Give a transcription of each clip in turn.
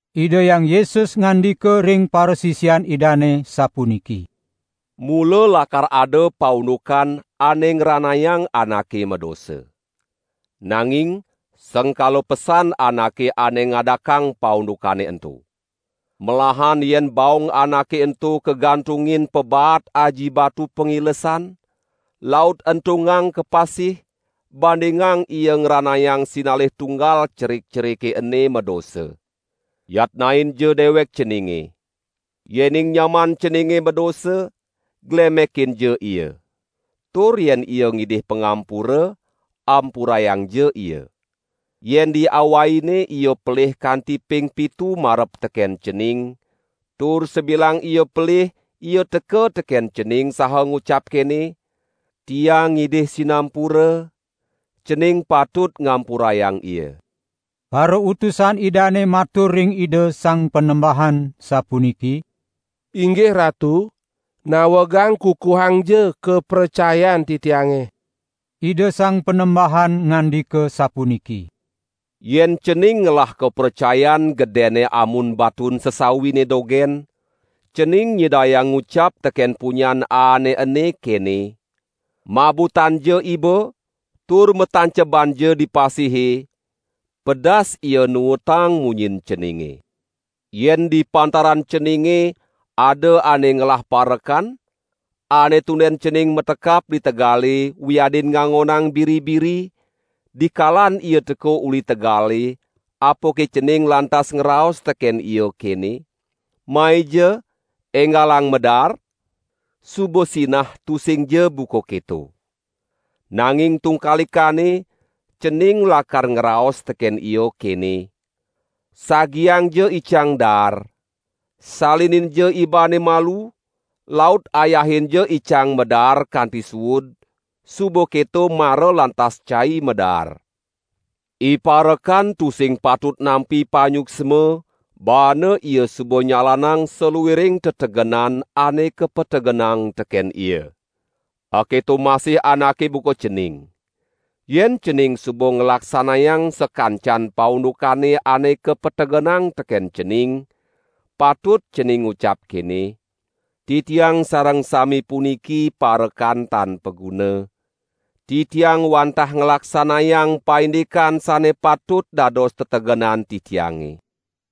Ida Hyang Yesus ngandika ring parasisian Idane sapuniki: "Mula lakar ada paundukan ane ngranayang anake madosa. Nanging sengkala pesan anake ane ngadakang paundukane ento! Melahan yen baong anake ento kagantungin pabaat aji batu pangilesan, laut entungang ka pasih, bandingang ia ngranayang sinalih tunggal cerik-cerike ene madosa. Yatnainja dewek ceninge! Yening nyaman ceninge madosa, glemekinja ia. Tur yen ia ngidih pangampura, ampurayangja ia. Yen diawaine ia pelih kanti ping pitu marep teken cening, tur sabilang ia pelih ia teka teken cening saha ngucap kene: 'Tiang ngidih sinampura,' cening patut ngampurayang ia." Parautusan Idane matur ring Ida Sang Panembahan sapuniki: "Inggih Ratu, nawegang kukuhangja kapracayan titiange!" Ida Sang Panembahan ngandika, sapuniki: "Yen cening ngelah kapracayan gedenne amun batun sesawine dogen, cening nyidayang ngucap teken punyan aane ene kene: 'Mabutanja iba, tur matancebanja di pasihe,' pedas ia nuutang munyin ceninge." "Yen di pantaran ceninge ada ane ngelah parekan, ane tunden cening matekap di tegale wiadin ngangonang biri-biri, dikalan ia teka uli tegale apake cening lantas ngraos teken ia kene: 'Maija enggalang madaar'? Suba sinah tusingja buka keto. Nanging tungkalikanne, cening lakar ngraos teken ia kene: 'Sagiangja icang daar. Salininja ibane malu, laut ayahinja icang madaar kanti suud, suba keto mara lantas cai madaar.' Iparekan tusing patut nampi panyuksma baana ia suba nyalanang saluiring tetegenan ane kapategenang teken ia. Aketo masih anake buka cening. Yen cening suba nglaksanayang sakancan paundukane ane kapategenang teken cening, patut cening ngucap kene: 'Titiang sareng sami puniki parekan tan paguna, titiang wantah nglaksanayang paindikan sane patut dados tetegenan titiange.' "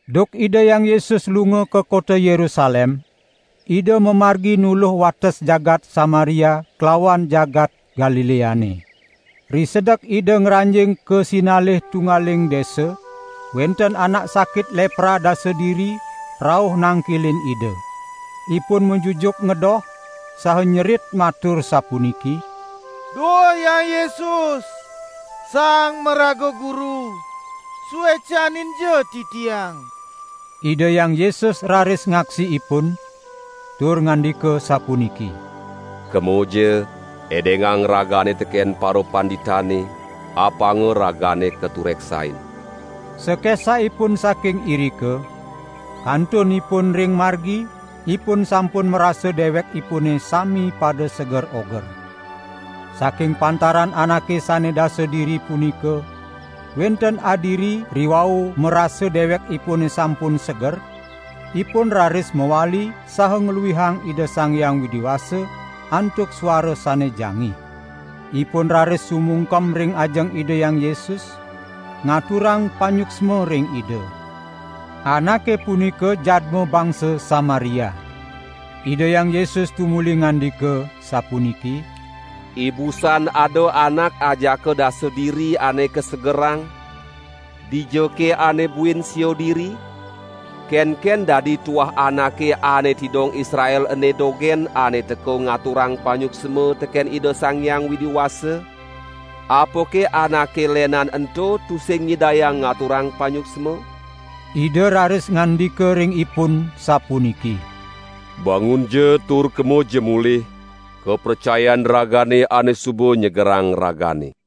Duk Ida Hyang Yesus lunga ka kota Yerusalem, Ida mamargi nuluh wates jagat Samaria klawan jagat Galileane. Risedek Ida ngranjing ka sinalih tunggaling desa, wenten anak sakit lepra dasa diri rauh nangkilin Ida. Ipun majujuk ngedoh, saha nyerit matur sapuniki: "Duh Hyang Yesus, Sang Maraga Guru, suecaninja titiang." Ida Hyang Yesus raris ngaksi ipun tur ngandika sapuniki: "Kemaja edengang ragane teken parapanditane, apanga ragane katureksain." Sakesah ipun saking irika, kantun ipun ring margi ipun sampun marasa dewekipune sami pada seger oger. Saking pantaran anake sane dasa diri punika, wenten adiri riwau marasa dewekipune sampun seger, ipun raris mawali saha ngluihang Ida Sang Hyang Widi Wasa antuk suara sane jangih. Ipun raris sumungkem ring ajeng Ida Hyang Yesus, ngaturang panyuksma ring Ida. Anake punika jadma bangsa Samaria. Ida Hyang Yesus tumuli ngandika, sapuniki: "Ibusan ada anak ajaka dasa diri ane kasegerang, dijake ane buin sia diri? Kenken dadi tuah anake ane tidong Israel ene dogen ane teka ngaturang panyuksma teken Ida Sang Hyang Widi Wasa? Apake anake lenan ento tusing nyidayang ngaturang panyuksma?" Ida raris ngandika ring ipun, sapuniki: "Bangunja tur kemaja mulih, kapracayan ragane ane suba nyegerang ragane."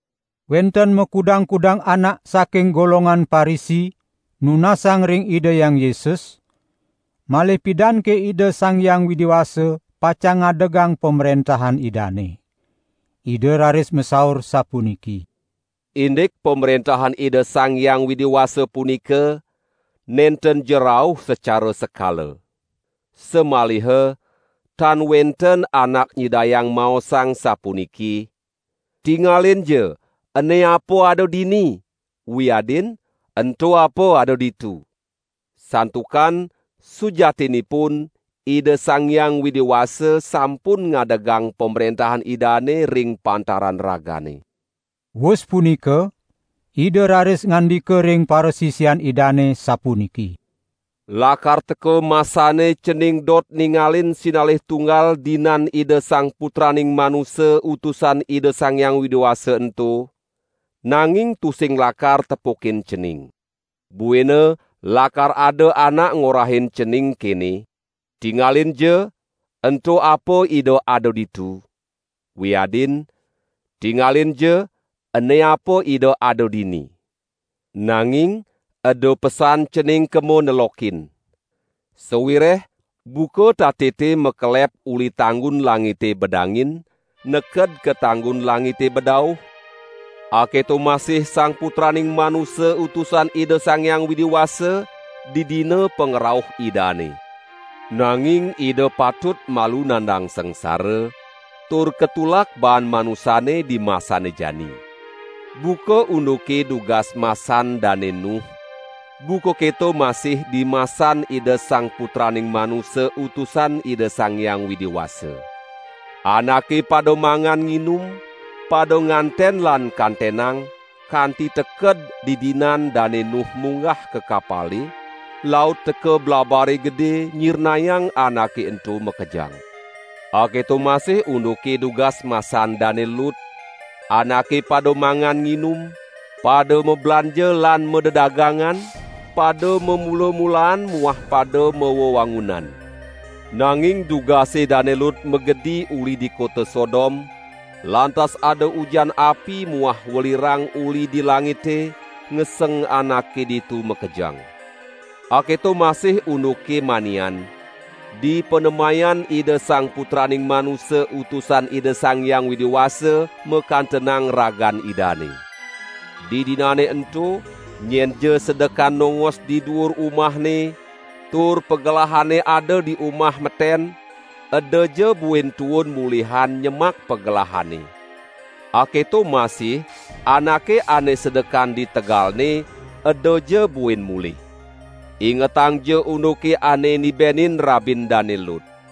Wenten makudang-kudang anak saking golongan Parisi nunasang ring Ida Hyang Yesus, malih pidanke Ida Sang Hyang Widi Wasa pacang ngadegang Pamrentahan Idane. Ida raris masaur sapuniki: "Indik Pamrentahan Ida Sang Hyang Widi Wasa punika, nentenja rauh sacara sekala. Samaliha tan wenten anak nyidayang maosang sapuniki: 'Tingalinja, ene apa ada dini!' wiadin: 'Ento apa ada ditu!' Santukan, sujatinipun Ida Sang Hyang Widi Wasa sampun ngadegang Pamrentahan Idane ring pantaran ragane." Wus punika Ida raris ngandika ring parasisian Idane sapuniki: "Lakar teka masane cening dot ningalin sinalih tunggal dinan Ida Sang Putraning Manusa Utusan Ida Sang Hyang Widi Wasa ento, nanging tusing lakar tepukin cening. Buina lakar ada anak ngorahin cening kene: 'Tingalinja, ento apa Ida ada ditu!' wiadin: 'Tingalinja, ene apa Ida ada dini!' Nanging eda pesan cening kema nelokin. Sawireh buka tatite makelep uli tanggun langite bedangin neked ka tanggun langite bedauh, aketo masih Sang Putraning Manusa Utusan Ida Sang Hyang Widi Wasa didina pangrauh Idane. Nanging Ida patut malu nandang sangsara, tur katulak baan manusane dimasane jani. Buka unduke dugas masan Dane Nuh, buka keto masih dimasan Ida Sang Putraning Manusa Utusan Ida Sang Hyang Widi Wasa. Anake pada mangan nginum, pada nganten lan kantenang, kanti teked didinan Dane Nuh munggah ka kapale, laut teka blabare gede nyirnayang anake ento makejang. Aketo masih unduke dugas masan Dane Lut, anake pada mangan nginum, pada mablanja lan madedagangan, pada mamula-mulaan muah pada mawewangunan. Nanging dugase Dane Lut magedi uli di kota Sodom, lantas ada ujan api muah welirang uli di langite ngeseng anake ditu makejang. Aketo masih unduke manian, dipanemayan Ida Sang Putraning Manusa Utusan Ida Sang Hyang Widi Wasa makantenang ragan Idane. Didinane ento nyenja sedekan nongos di duur umahne, tur pagelahane ada di umah meten, edaja buin tuun mulihan nyemak pagelahanne. Aketo masih anake ane sedekan di tegalne, edaja buin mulih. Ingetangja unduke ane nibenin rabin Dane Lut.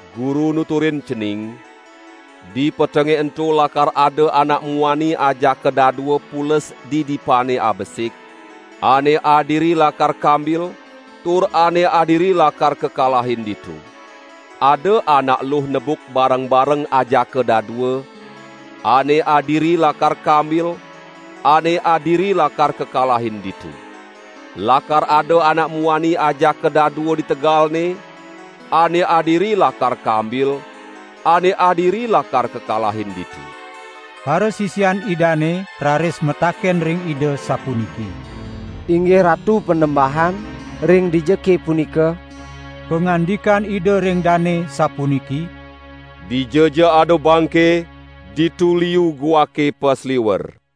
Guru nuturin cening, dipetenge ento lakar ada anak muani ajaka dadua pules di dipane abesik, ane adiri lakar kambil, tur ane adiri lakar kakalahin ditu. Ada anak eluh nebuk bareng-bareng ajaka dadua, ane adiri lakar kambil ane adiri lakar kakalahin ditu. ( Lakar ada anak muani ajaka dadua di tegalne, ane adiri lakar kambil ane adiri lakar kakalahin ditu.)" Parasisian Idane raris mataken ring Ida, sapuniki: "Inggih Ratu Panembahan, ring dijake punika?" Pangandikan Ida ring dane sapuniki: "Dijaja ada bangke, ditu liu guake pasliwer."